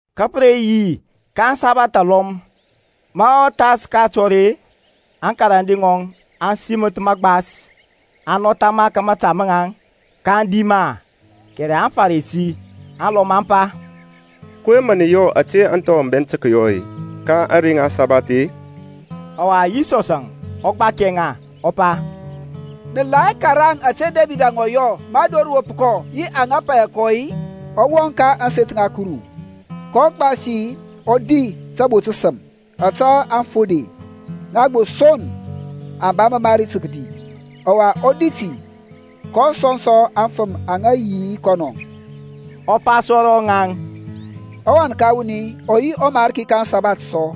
Ka pə re yi ka asabath alɔm ma ɔ thas ka atɔr-e, aŋkarande ŋɔŋ aŋ siməth magbas, aŋ nɔtha ma ka mȧta maŋ, kaŋ di ma. Kɛrɛ aŋFarisi alɔm aŋ pa, kɔyɛŋ mə nə yɔ ȧte aŋthɔ aŋ bɛnt tə kəyɔ ka ȧŋrey ŋa aŋsabath-e? Ɔwa Yisɔsȧŋ ɔ gbakia ŋa, ɔ pa, Nə la hɛ karaŋ ȧte Debid ɔ yɔ ma dor rə wop kɔ yi aŋa paya kɔ-i? Ɔ wɔŋ ka ȧŋseth ŋa Kuru, kɔ gbasi, ɔ di tabo təsəm ȧte aŋfode, ŋa gbo son aŋ ba mamari tə kədi, ɔwa ɔ di ti kɔ sɔŋ sɔ aŋfəm aŋa yi yi kɔnɔ. Ɔ pa sɔ ro ŋaŋ, ɔWan ka wuni ɔ yi ɔMarki ka aŋsabath sɔ.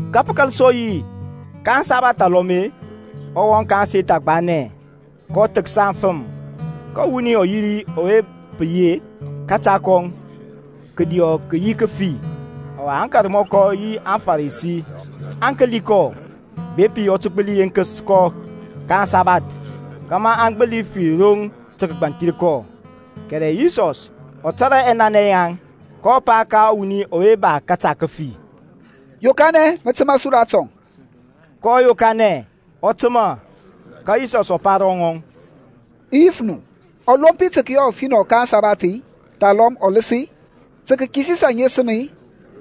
Ka pə kȧl sɔ yi ka aŋsabath alɔm-e, ɔ wɔŋ ka ȧŋseth agbanɛ, kɔ thəksa aŋfəm. Ka wuni ɔ yi ri ɔwe pə yi-e, kȧta kɔŋ kədiɔ kə yi kəfi. Ɔwa aŋkarmɔkɔ yi aŋFarisi aŋ kəli kɔ, bepi ɔ tə gbəli yenkəs kɔ ka aŋsabath, kȧmȧ aŋ gbəli fir roŋ tə kəgbanthir kɔ. Kɛrɛ Yisɔs ɔ tȧrȧ ɛnanɛ yaŋ, kɔ pa ka ɔwuni ɔwe ba kȧta kəfi, Yokanɛ, mə təmȧ su ratɔŋ. Kɔ yokanɛ, ɔ təmȧ. Ka Yisɔsȧŋ ɔ pa ro ŋaŋ, I yif nu, ɔlompi tə kəyɔ ɔfinɔ ka ȧŋsabath-i, thalɔm ɔləs-i? Tə kəkisis aŋesəm-i,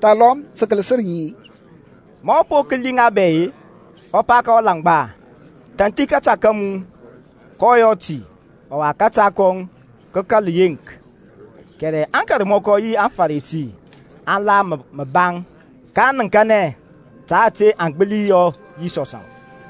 thalɔm tə kələsər ŋi-e? Ma ɔ po kəli ŋa bɛ-e, ɔ pa ka ɔlaŋgba. Thanthi kȧta ka mu. Kɔ yɔ ti, ɔwa kȧta kɔŋ kə kȧl yeŋk. Kɛrɛ aŋkarmɔkɔ yi aŋFarisi aŋ la məbaŋ, ka aŋ nəŋkanɛ ta ȧte aŋ gbəli yɔ Yisɔsȧŋ.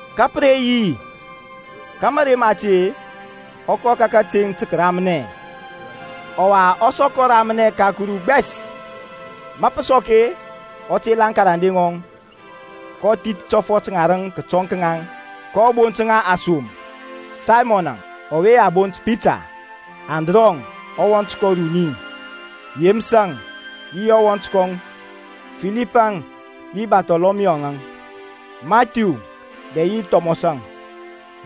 Ka pə re yi ka mȧrey mati-e, ɔ kɔ ka kateŋ tə kəramnɛ. Ɔwa ɔ sɔkɔ ramnɛ ka Kuru gbɛs. Ma pə sɔk-e, ɔ tela aŋkarande ŋɔŋ, kɔ thith tɔfɔt ŋarəŋ kətɔŋ ka ŋaŋ, kɔ bont ŋa asom. Saymɔnȧŋ, (ɔwe a bont Pita) Andrɔŋ, ɔwɔnt kɔŋ uruni, Yeməsȧŋ yi Yɔnȧŋ, Filipȧŋ yi Barthɔlɔmiyuȧŋ, Mathiu dɛ yi Thɔmɔsȧŋ,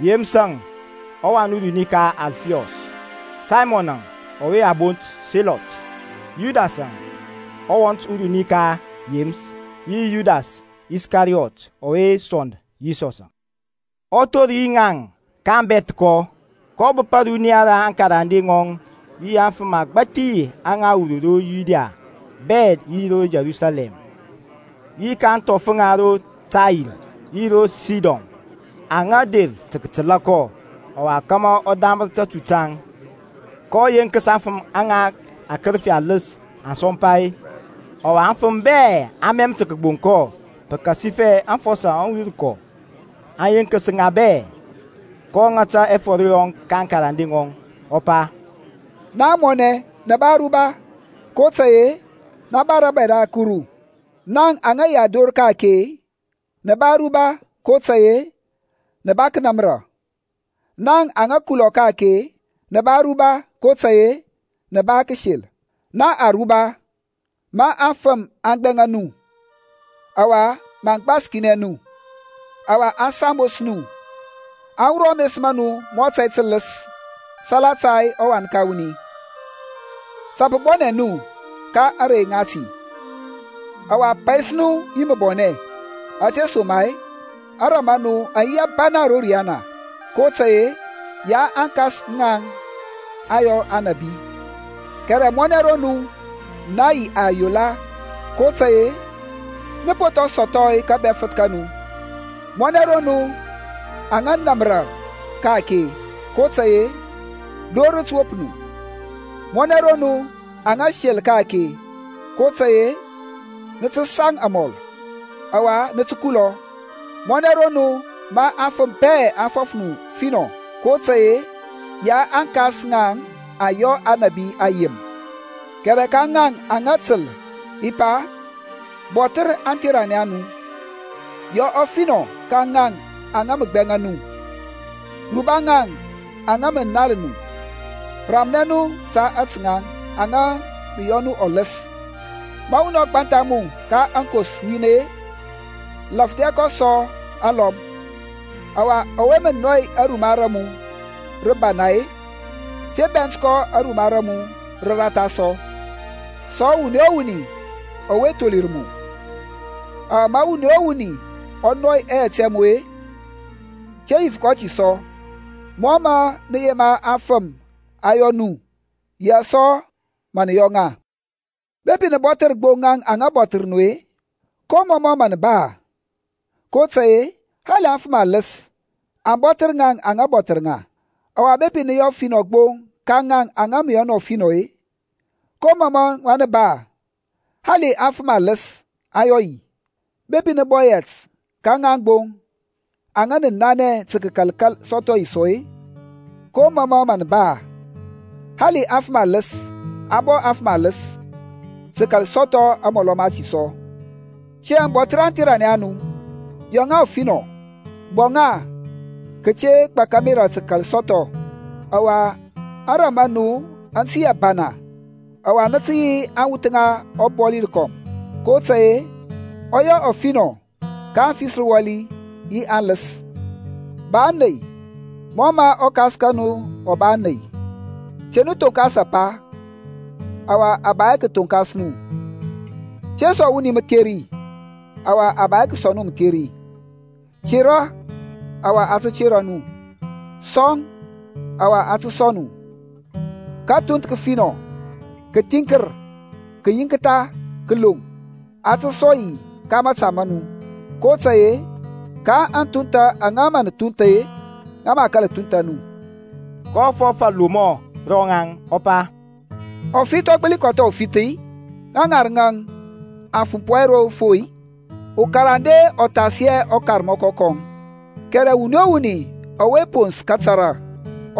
Yeməsȧŋ ɔwan uruni ka Alfiɔs, Saymɔnȧŋ ɔwe a bont Selɔt, Yudasȧŋ ɔwan uruni ka Yeməs, yi Yudas Iskariyɔt ɔwe sɔnd Yisɔs. Ɔ thor yi ŋaŋ ka abɛthkɔ, kɔ bəp ȧruniya ra aŋkarande ŋɔŋ yi afəm agbȧthi aŋa wur ro Yudia bɛ yi ro Yerusalɛm, yi ka ȧŋthɔf ŋa ro Tair yi ro Sidon, aŋa der tə kətəla kɔ, ɔwa kȧmȧ ɔ damər tatu taŋ. kɔ yenkəs aŋfəm aŋa akərəfi aləs aŋ sɔmpa-e. Ɔwa aŋfəm bɛ aŋ mɛm tə kəgboŋ kɔ, pəkasifɛ afɔsɔ aŋ wur kɔ, aŋ yenkəs ŋa bɛ. kɔ ŋata ɛfɔr yɔŋ ka aŋkarande ŋɔŋ, ɔ pa, Naŋ amɔnɛ nə ba aruba, kotȧy-e na ba rȧbȧy ra Kuru. Naŋ aŋa yi ador ka-ake nə ba aruba, kotȧy-e nə ba kənamra. Naŋ aŋa kulɔ ka-ake nə ba aruba, kotȧy-e nə ba kəsel. Na aruba, ma afəm aŋ gbɛŋa nu, ɔwa maŋ gbaskinɛ nu, ɔwa aŋ sambos nu, aŋ wurɔ ames ma nu mɔ tȧy tələs salata ɔWan ka wuni. Tə pə bɔnɛ nu ka ȧŋrey ŋati, ɔwa pais nu yi məbɔnɛ; ȧtesoma-e ȧŋrȧm a nu aŋ yi abana ro riyana. Kotȧy-e ya aŋkas a ŋaŋ aŋ yɔ aŋnabi. Kɛrɛ mɔnɛ ro nu na yi ayola, kotȧy-e nə po thɔŋ sɔthɔ kȧbɛfəth ka nu. Mɔnɛ ro nu aŋa namra ka-ake, kotȧy-e dor rə tə wop nu. Mɔnɛ ro nu aŋa sel ka-ake, kotȧy-e nə tə saŋ amɔl, ɔwa nə tə kulɔ. Mɔnɛ ro nu ma afəm bɛ aŋ fɔf nu ɔfinɔ, kotȧy-e ya aŋkas a ŋaŋ aŋ yɔ aŋnabi ayem. Kɛrɛ ka ŋaŋ aŋa təl i pa, Bɔthər aŋtheranɛ a nu, yɔ ɔfinɔ ka ŋaŋ aŋa mə gbɛŋa nu, ruba ŋaŋ aŋa mə nal nu, ramnɛ nu ta ŋaŋ aŋa mə yɔ nu ɔləs. Ma wuni ɔ gbantha mu ka aŋkos ŋin-e, laŋklia kɔ sɔ aŋlɔm; ɔwa ɔwe mə nɔy aruma ra mu rəbana-e, te bɛnt kɔ aruma ra mu rəratha sɔ. Sɔŋ wuni o wuni ɔwe tholir mu, ɔwa ma wuni o wuni ɔ nɔy ɛyɛt ɛ mu-e, te yif kɔ ti sɔ. Mɔ mȧ nə yema aŋfəm aŋ yɔ nu yaŋ sɔ mə nə yɔ ŋa. Bepi nə bɔthər gbo ŋaŋ aŋa bɔthər nu-e, ko mɔmɔ mȧ nə ba-e? kotȧy-e hali aŋfəm aləs aŋ bɔthər ŋaŋ aŋa mə bɔthər ŋa. Ɔwa bepi nə yɔ ɔfinɔ gbo ka ŋaŋ aŋa mə yɔ nu ɔfinɔ-e, ko mɔmɔ mə nə ba-e? Hali aŋfəm aləs aŋ yɔ yi. Bepi nə bɔ yɛt ka ŋaŋ gbo aŋa əŋ nanɛ tə kəkal sɔthɔ yi sɔ-e, ko mɔmɔ mə nə ba-e? Hali aŋfəm aləs aŋ bɔ afəm aləs, tə kəkal sɔthɔ amɔlɔ mati sɔ. Tiyȧŋ bɔthər aŋtheranɛ a nu, yɔ ŋa ɔfinɔ, bɔ ŋa kate gbak ȧmerȧ tə kəkal sɔthɔ; ɔwa ȧŋrȧm a nu aŋ tə yi abana, ɔwa nə tə yi aŋwuth ŋa ɔBɔli rəkɔm. Kotȧy-e ɔ yɔ ɔfinɔ ka aŋfisrəwali yi aŋləs. Ba ȧney mɔ mə ɔKas ka nu ɔ ba ȧney. Te nu thonkas apa, ɔwa a ba hɛ tə kəthoŋkas nu. Te sɔŋ wuni mətheri. Ɔwa a ba hɛ tə kəsɔŋ nu mətheri. Tera, ɔwa a tə tera nu. Sɔŋ, ɔwa a tə sɔŋ nu, kəthunth kəfinɔ, kəthiŋkər, kəyinktha, kəloŋ, a tə sɔŋ yi ka mȧta mȧnu. Kotȧy-e, ka aŋthuntha aŋa mə nə thunth-e, ŋa mə a kȧl thuntha nu. kɔ fɔf alomɔ ro ŋaŋ, ɔ pa, Ɔfith ɔ gbəli kɔtha ufith-i? Ŋa ŋarəŋ aŋ fumpɔ hɛ ro fo-i? Ukarande ɔ thas hɛ ɔkarmɔkɔ kɔŋ, kɛrɛ wuni o wuni ɔwe pons kətara,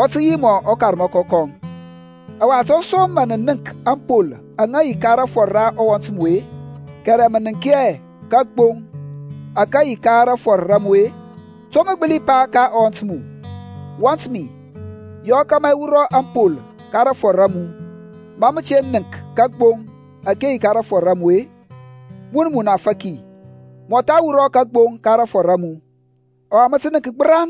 ɔ tə yi mɔ ɔkarmɔkɔ kɔŋ. Ɔwa to som mə nə nənk ȧŋpol aŋa yi ka rafɔr ra ɔwɔnt mu-e, kɛrɛ mə nənk hɛ kagboŋ ȧke yi ka rafɔr ra mu-e? To mə gbəli pa ka ɔwɔnt mu, Wɔnt mi, yɔ kȧmȧ i wurɔ ȧŋpol ka rafɔr ra mu, ma mə te nənk kagboŋ ȧke yi ka rafɔr ra mu-e? Mun munafaki, mɔtha wurɔ kagboŋ ka rafɔr ra mu, ɔwa mə tə nənk gbəraŋ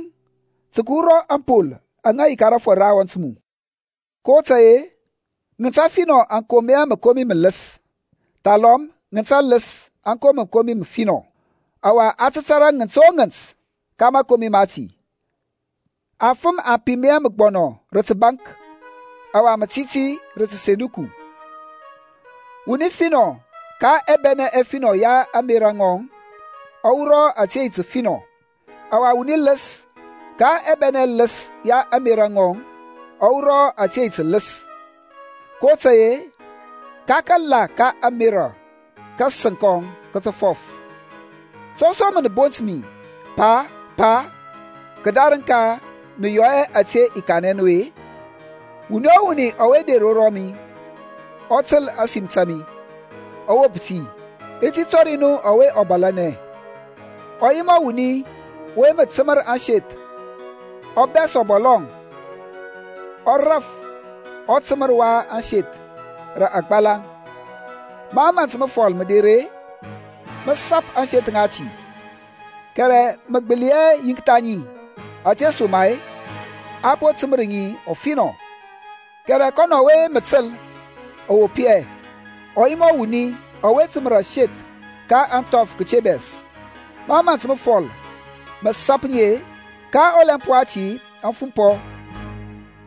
tə kəwura ȧŋpol aŋa yi ka rafɔr ra ɔwɔnt mu. kotȧy-e, ŋənt ȧfinɔ aŋ kom hɛ məkomi mələs, thalɔm ŋənt ələs aŋ kom hɛ məkomi məfinɔ. Ɔwa a tȧrȧ ŋənt o ŋənt ka mȧkomi mati. Afəm aŋ pim hɛ məgbɔnɔ rə təbaŋk, ɔwa mətiti rə təsenduku. Wuni finɔ ka ɛbɛnɛ ɛfinɔ ya ȧŋmerȧ ŋɔŋ ɔ wurɔ ȧte yi təfinɔ; ɔwa wuni ləs ka ɛbɛnɛ ɛləs ya ȧŋmerȧ ŋɔŋ ɔ wurɔ ȧte yi tələs. Kotȧy-e ka kala ka ȧŋmerȧ kȧsəŋ kɔŋ kə tə fɔf. To som nə bont mi, Pa, Pa, kədarəŋ ka nə yɔ hɛ ȧte i kanɛ nu-e? Wuni o wuni ɔwe der ro rɔmi, ɔ təl ȧsim ta mi, ɔ wop ti, i ti tɔri nu ɔwe ɔ bȧlȧnɛ. Ɔ yi mɔ wuni ɔwe mə təmər aseth. Ɔ bɛs ɔbɔlɔŋ, ɔ raf ɔtəmər wa ȧŋseth rə agbalaŋ. Ma ȧmȧnt məfɔl mə der-e, mə sap ȧŋseth ŋati, kɛrɛ mə gbəli hɛ yiŋktha ŋi, ȧtesoma-e a po təmər ŋi ɔfinɔ. Kɛrɛ kɔnɔ ɔwe mə təl, ɔ wop hɛ, ɔ yi mɔ wuni ɔwe təmər aseth ka ȧŋthɔf kəte bɛs. Ma ȧmȧnt məfɔl mə sap ŋi-e, ka ɔlɛmp wati aŋ fumpɔ,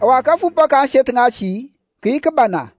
ɔwa kafumpɔ ka ȧŋseth ŋati kə yi kəbana.